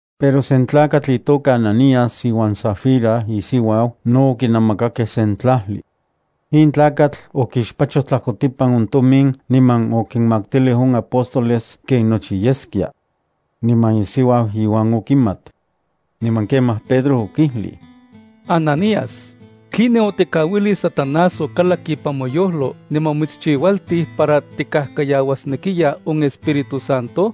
Pero sen tlakatl itoka Ananías iuan Safira isiuau no okinamakakej sen tlajli. In tlakatl okixpachoj tlajkotipan on tomin niman okinmaktilij on apóstoles ken nochi yeskia. Niman isiuau iuan okimat. Niman kemaj Pedro okijlij: —Ananías, ¿tline otikauilij Satanás okalak ipan moyojlo niman omitschiualtij para tikajkayauasnekiya on Espíritu Santo?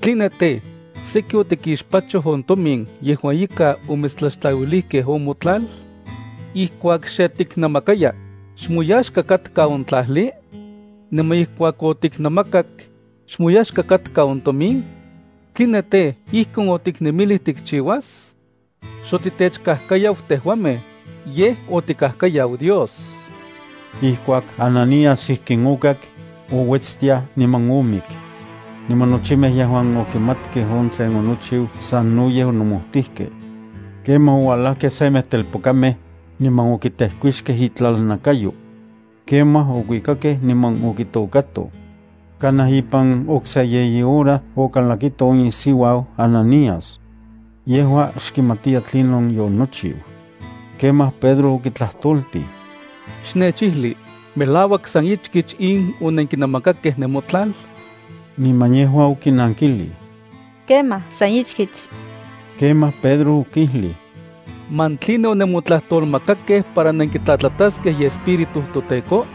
¿Tline tej, seki otikixpachoj on tomin yejuan ika omitstlaxtlauilijkej on motlal? Ijkuak xe tiknamakaya, ¿xmoyaxka katka on tlajli? Niman ijkuak otiknamakak, ¿xmoyaxka katka on tomin? ¿Tline tej, ijkon otiknemilij tikchiuas? Xotitechkajkayau tejuamej, yej otikajkayau Dios. Ijkuak Ananías ijkin okak, ouetstiaj niman omik. Niman nochimej yejuan okimatkej on tlen onochiu sanoyej onomojtijkej. Kemaj oualajkej semej telpokamej, niman okitejkuixkej itlalnakayo. Kemaj okuikakej niman okitokatoj. Kanaj ipan okse yeyi hora okalakito on isiuau Ananías. Yejua xkimatiya tlinon yonochiu. Kemaj Pedro okitlajtoltij: —Xnechijli, ¿melauak san ichkich in onenkinamakakej nemotlal? Niman yejua okinankilij: —Kemaj, san ichkich. Kemaj Pedro okijlij: —¿Man tline onemotlajtolmakakej para nenkitlatlataskej iEspíritu toTEKO?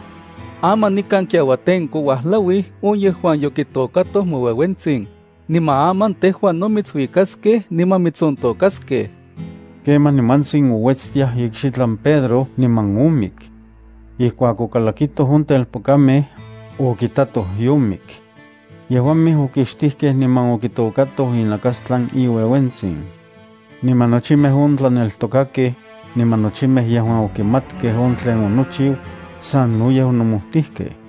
Aman nikan kiauatenko uajlauij on yejuan yokitokatoj moueuentsin, niman aman tejua no mitsuikaskej niman mitsontôkaskej. Kemaj nimantsin ouetstiaj ikxitlan Pedro niman omik. Ijkuak okalakitoj on telpokamej, okitatoj yomik. Yejuamej okixtijkej niman okitokatoj inakastlan iueuentsin. Niman nochimej on tlaneltokakej, niman nochimej yejuan okimatkej on tlen onochiu, sanoyej onomojtijkej.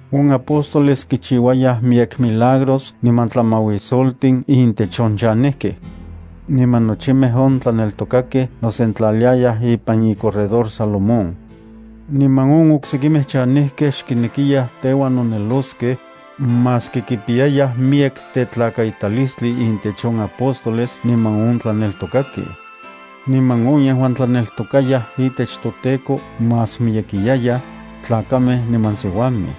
On apóstoles kichiuayaj miyek milagros niman tlamauisoltin intech on chanejkej. Niman nochimej on tlaneltokakej nosentlaliayaj ipan iCorredor Salomón. Niman on oksekimej chanejkej xkinekiyaj teuan noneloskej, maski kipiyayaj miyek tetlakaitalistli intech on apóstoles niman on tlaneltokakej. Niman on yejuan tlaneltokayaj itech toTEKO más miyekiyayaj, tlakamej niman siuamej.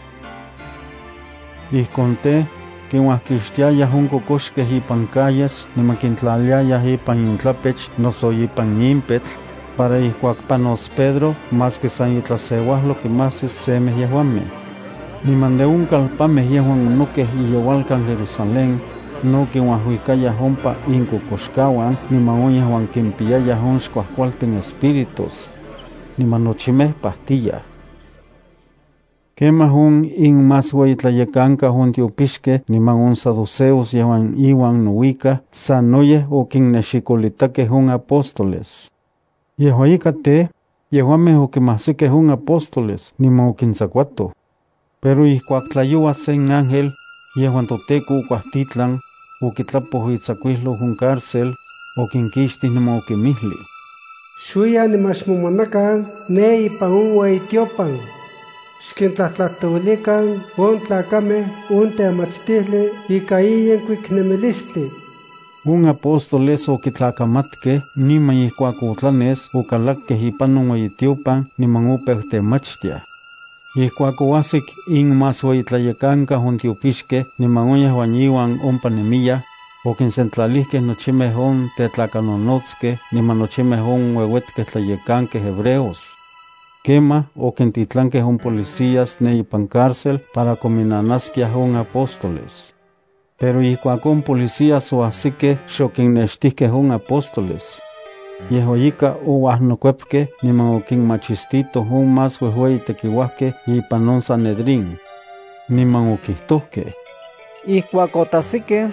Ijkon tej, kinuajkixtiayaj on kokoxkej ipan calles niman kintlaliayaj ipan intlapech noso ipan impetl para ijkuak panos Pedro maski san itlaseuajlo kimajsis semej yejuamej. Niman de on kalpanmej yejuan onokej iyeualkan Jerusalén, no kinuajuikayaj ompa inkokoxkauan niman on yejuan kimpiyayaj on xkuajkualtin espíritus. Niman nochimej pajtiyaj. Kemaj on inmasueyitlayekankau on tiopixkej niman on saduceos yejuan iuan nouikaj sanoyej okinnexilolitakej on apóstoles. Yejua ika tej, yejuamej okimajsikej on apóstoles niman okintsakuatoj. Pero ijkuak tlayoua sen ángel, yejuan toTEKO okuajtitlan, okitlapoj itsakuijlou on cárcel, okinkixtij, niman okinmijlij: —Xuiyan niman xmomanakan ne ipan on ueyitiopan. Xkintlajtlajtouilikan on tlakamej on temachtijli ika in yenkuik nemilistli. On apóstoles okitlakamatkej niman ijkuak otlanes okalakkej ipan on ueyitiopan niman opeu temachtiaj. Ijkuak oajsik inmasueyitlayekankau on tiopixkej niman on yejuan iuan ompa nemiyaj, okinsentlalijkej nochimej on tetlakanonotskej niman nochimej on ueuetkej tlayekankej hebreos. Kemaj okintitlankej on policías ne ipan cárcel para kominnanaskiaj on apóstoles. Pero ijkuak on policías oajsikej xokinnextijkej on apóstoles. Yejua ika ouajnokuepkej niman okinmachistitoj on más uejueyitekiuajkej ipan on Sanedrín. Niman okijtojkej: —Ijkuak otajsikej,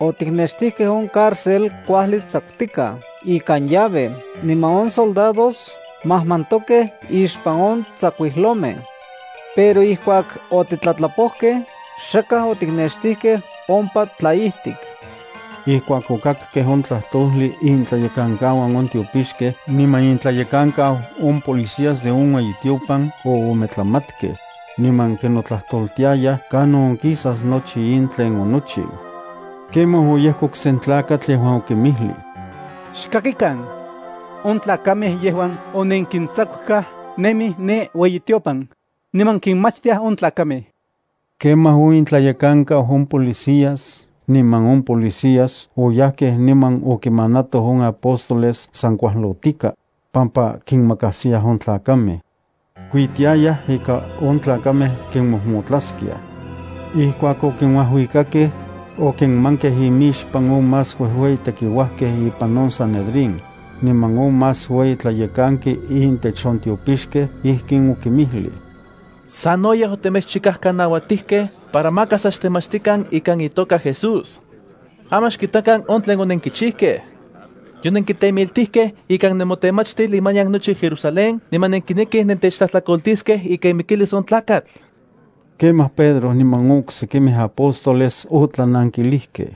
otiknextijkej on cárcel kuajli tsakutikaj ikan llave niman on soldados majmantokej ixpan on tsakuijlomej. Pero ijkuak otitlatlapojkej xakaj otiknextijkej ompa tlaijtik. Ijkuak okakkej on tlajtojli, intlayekankauan on tiopixkej niman intlayekankau on policías de on ueyitiopan oometlamatkej, niman kinotlajtoltiayaj kanon onkisas nochi in tlen onochiu. Kemaj oyejkok sen tlakatl yejuan okinmijlij: —Xkakikan, on tlakamej yejuan onenkintsakukaj nemij ne ueyitiopan, niman kinmachtiaj on tlakamej. Kemaj on intlayekankau on policías niman on policías oyajkej niman okimanatoj on apóstoles san kuajlotika, pampa kinmakajsiyaj on tlakamej. Kuitiayaj ika on tlakamej kinmojmotlaskiaj. Ijkuak okinuajuikakej, okinmankej inmixpan on más uejueyi tekiuajkej ipan on Sanedrín, niman on más ueyi tlayekanki intech on tiopixkej. Ijkin okinmijlij: —Sanoyej otemechchikajkanauatijkej para maka sa xtemachtikan ikan itoka Jesús. Aman xkitakan on tlen onenkichijkej. Yonenkitemiltijkej ikan nemotemachtil imanian nochi Jerusalén niman nenkinekij nentechtlajtlakoltiskej ika imikilis on tlakatl. Kemaj Pedro niman on oksekimej apóstoles otlanankilijkej: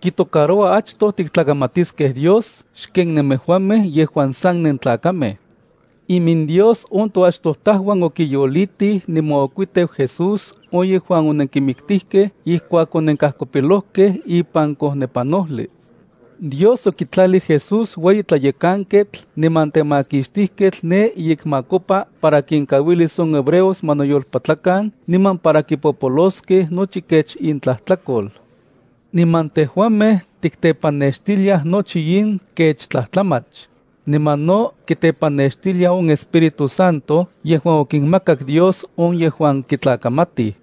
—Kitocaroua achtoj tiktlakamatiskej Dios xken nemejuamej yejuan san nentlakamej. IminDios on toachtojtajuan okiyolitij niman okuiteu Jesús on yejuan onenkimiktijkej ijkuak onenkajkopilojkej ipan kojnepanojli. Dios okitlalij Jesús ueyi tlayekanketl niman temakixtijketl ne iyekmakopa para kinkauilis on hebreos ma noyolpatlakan niman para kipopoloskej nochi kech intlajtlakol. Niman tejuamej tiktepanextiliaj nochi in kech tlajtlamach, niman no kitepanextilia on Espíritu Santo yejuan okinmakak Dios on yejuan kitlakamatij.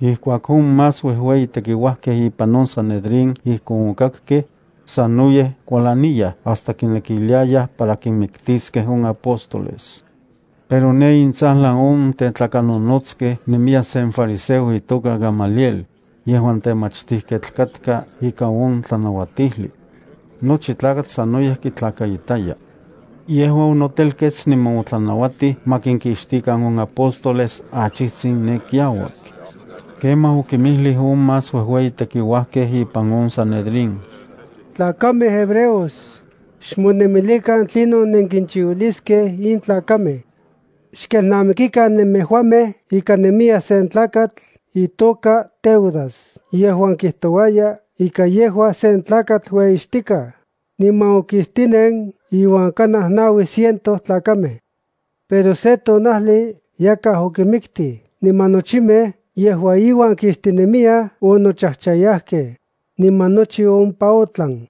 Ijkuak on más uejueyi tekiuajkej ipan on Sanedrín ijkon okakkej, sanoyej kualaniyaj hasta kinekiliayaj para kinmiktiskej on apóstoles. Pero ne intsajlan on tetlakanonotskej nemiya sen fariseo itoka Gamaliel, yejuan temachtijketl katka ika on tlanauatijli. Nochi tlakatl sanoyej kitlakaitaya. Yejua onotelkets niman otlanauatij ma kinkixtikan on apóstoles achijtsin ne kiauak. Kemaj okinmijlij on más uejueyi tekiuajkej ipan on Sanedrín: —Tlakamej hebreos, kuajli xmonemilikan tlinon nenkinchiuiliskej in tlakamej. Xkelnamikikan nemejuamej ika nemiya sen tlakatl itoka Teudas yejuan kijtouaya ika yejua sen tlakatl ueyixtikaj, niman okistinen iuan kanaj naui ciento tlakamej. Pero se tonajli yakaj okimiktij niman nochimej yejuan iuan kistinemyaj onochajchayajkej, niman nochi ompa otlan.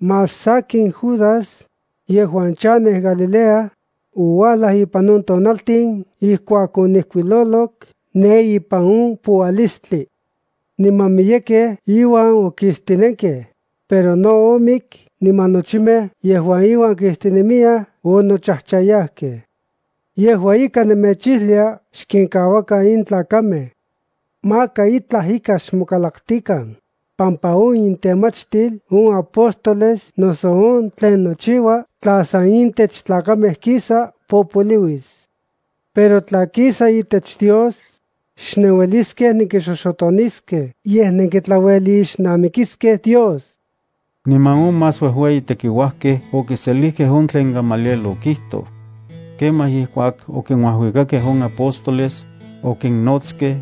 Más sakin Judas, yejuan chanej Galilea, ouajlaj ipan on tonaltin ijkuak onijkuilolok ne ipan on poualistli. Niman miyekej iuan okistinenkej, pero no omik niman nochimej yejuan iuan kistinemiyaj onochajchayajkej. Yejua ika, nemechijlia xkinkauakan in tlakamej. Maka itlaj ika xmokalaktikan, pampa on intemachtil on apóstoles noso on tlen nochiua tla san intech tlakamej kisa, popoliuis. Pero tla kisa itech Dios, xnenueliskej nenkixoxotoniskej, yej nenkitlauelixnamikiskej Dios. Niman on más uejueyi tekiuajkej ipan on sanedrín okiselijkej on tlen Gamaliel okijtoj. Kemaj ijkuak okinuajuikakej on apóstoles, okinnotskej,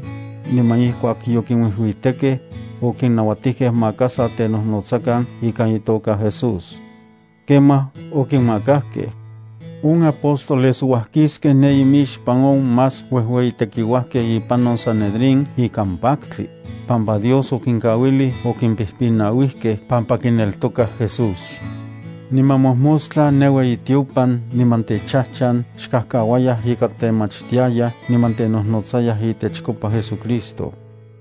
niman ijkuak yokinuijuitekej, okinnauatijkej maka sa tenojnotsakan ikan itoka Jesús. Kemaj okinmakajkej. On apóstoles ouajkiskej ne imixpan on más uejueyi tekiuajkej ipan on Sanedrín ikan paktli, pampa Dios okinkauilij okimpijpinauijkej pampa kineltokayaj Jesús. Niman mojmostla ne ueyitiopan niman techajchan xkajkauayaj ika temachtiayaj niman tenojnotsayaj itechkopa JesuCristo.